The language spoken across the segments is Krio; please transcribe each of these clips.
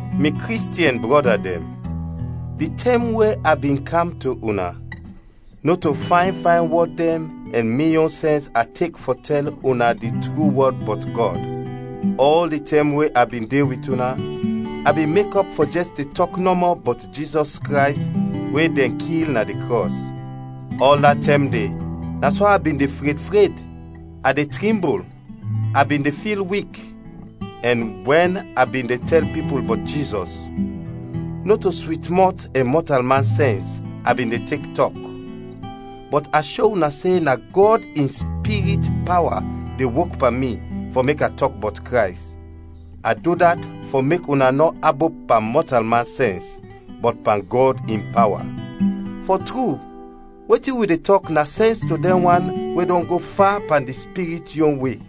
Mi Kristiɛn brɔda dɛn, di tɛm we a bin kam to una, nɔto fayn fayn wɔd dɛn ɛn mi yon sɛns a tek fɔ tɛl una di tru wɔd bɔt Gɔd. Ɔl di tɛm we a bin de wit una, a bin mekɔp fɔ jɛs de tɔk nɔmɔ bɔt Jizɔs Krays we dɛn kil na di krɔs. Ɔl da tɛm de na so a bin de fred fred, a de trimbul, a bin de fil wik. Ɛn wɛn a bin de tɛl pipul bɔt Jizɔs, nɔto swit mɔt ɛn mɔtalman sɛns a bin de tek tɔk, bɔt a sho una se na Gɔd in Spirit pawa de wok pan mi fɔ mek a tɔk bɔt Krays. A du dat fɔ mek una nɔ abop pan mɔtalman sɛns, bɔt pan Gɔd in pawa. Fɔ tru, wetin wi de tɔk na sɛns to dɛn wan we dɔn go fa pan di Spirit yon we.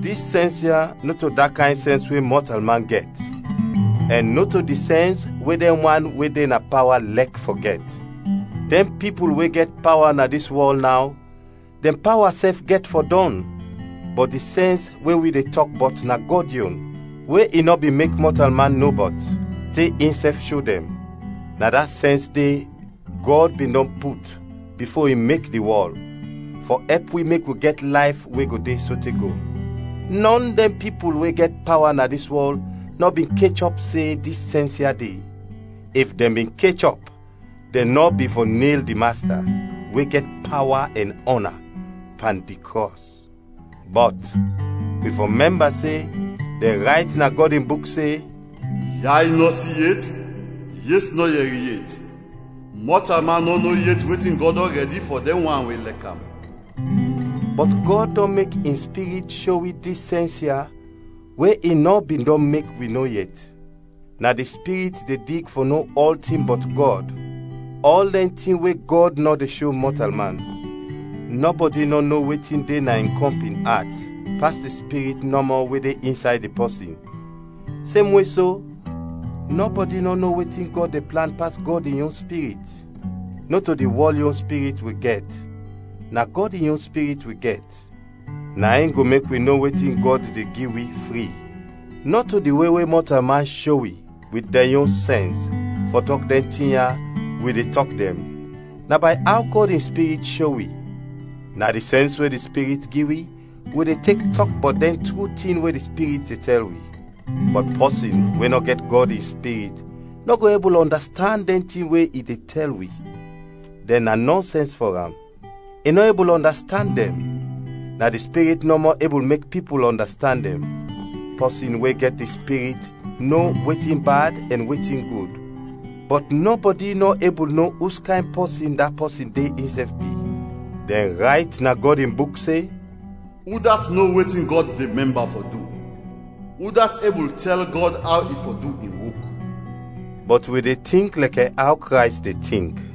Dis sɛns ya nɔto da kayn sɛns we mɔtalman gɛt, ɛn nɔto di sɛns we dɛn wan we de na pawa lɛk fɔ gɛt. Dɛn pipul we gɛt pawa na dis wɔl naw, dɛn pawa sɛf gɛt fɔ dɔn. Bɔt di sɛns we wi de tɔk bɔt na Gɔd yon, we i nɔ bin mek mɔtalman no bɔt, te insɛf sho dɛn; na da sɛns de Gɔd bin dɔn put, bifo i mek di wɔl, fɔ ɛp wi mek wi gɛt layf we go de sote go. Nɔn dɛn pipul we gɛt pawa na dis wɔl nɔ bin kechɔp se dis sɛns ya de, if dɛn bin kechɔp dɛn nɔ bin fɔ nel di Masta, we gɛt pawa ɛn ɔna, pan di krɔs. Bɔt, wi fɔ mɛmba se, dɛn rayt na Gɔd in Buk se, “Yay nɔ si yet, yes nɔ yɛri yet, mɔtalman nɔ no yet wetin Gɔd dɔn rɛdi fɔ dɛn wan we lɛk am.” Bɔt Gɔd dɔn mek in Spirit sho wi dis sɛns ya we i nɔ bin dɔn mek wi no yet. Na di Spirit de dig fɔ no ɔltin bɔt Gɔd, ɔl dɛn tin we Gɔd nɔ de sho mɔtalman. Nɔbɔdi nɔ no wetin de na in kɔmpin at pas di spirit nɔmɔ we de insay di pɔsin, semwe so nɔbɔdi nɔ no wetin Gɔd de plan pas Gɔd in yon Spirit. Nɔto di wɔl yon spirit wi gɛt, na Gɔd in yon Spirit wi gɛt; na in go mek wi no wetin Gɔd de gi wi fri. Nɔto di we we mɔtalman sho wi, wit dɛn yon sɛns, fɔ tɔk dɛn tin ya, wi de tɔk dɛn, na bay aw Gɔd in Spirit sho wi, na di sɛns we di Spirit gi wi, wi de tek tɔk bɔt dɛn tru tin we di Spirit de tɛl wi. Bɔt pɔsin we nɔ gɛt Gɔd in Spirit nɔ go ebul ɔndastand dɛn tin we i de tɛl wi, dɛn na nɔnsɛns fɔ am; i nɔ ebul ɔndastand dɛn, na di Spirit nɔmɔ ebul mek pipul ɔndastand dɛn. Pɔsin we gɛt di Spirit no wetin bad ɛn wetin gud, bɔt nɔbɔdi nɔ ebul no uskayn pɔsin da pɔsin de insɛf bi. Dɛn rayt na Gɔd in Buk se, “Udat no wetin Gɔd de mɛmba fɔ du? Udat ebul tɛl Gɔd aw i fɔ du in wok?” Bɔt wi de tink lɛkɛ aw Krays de tink.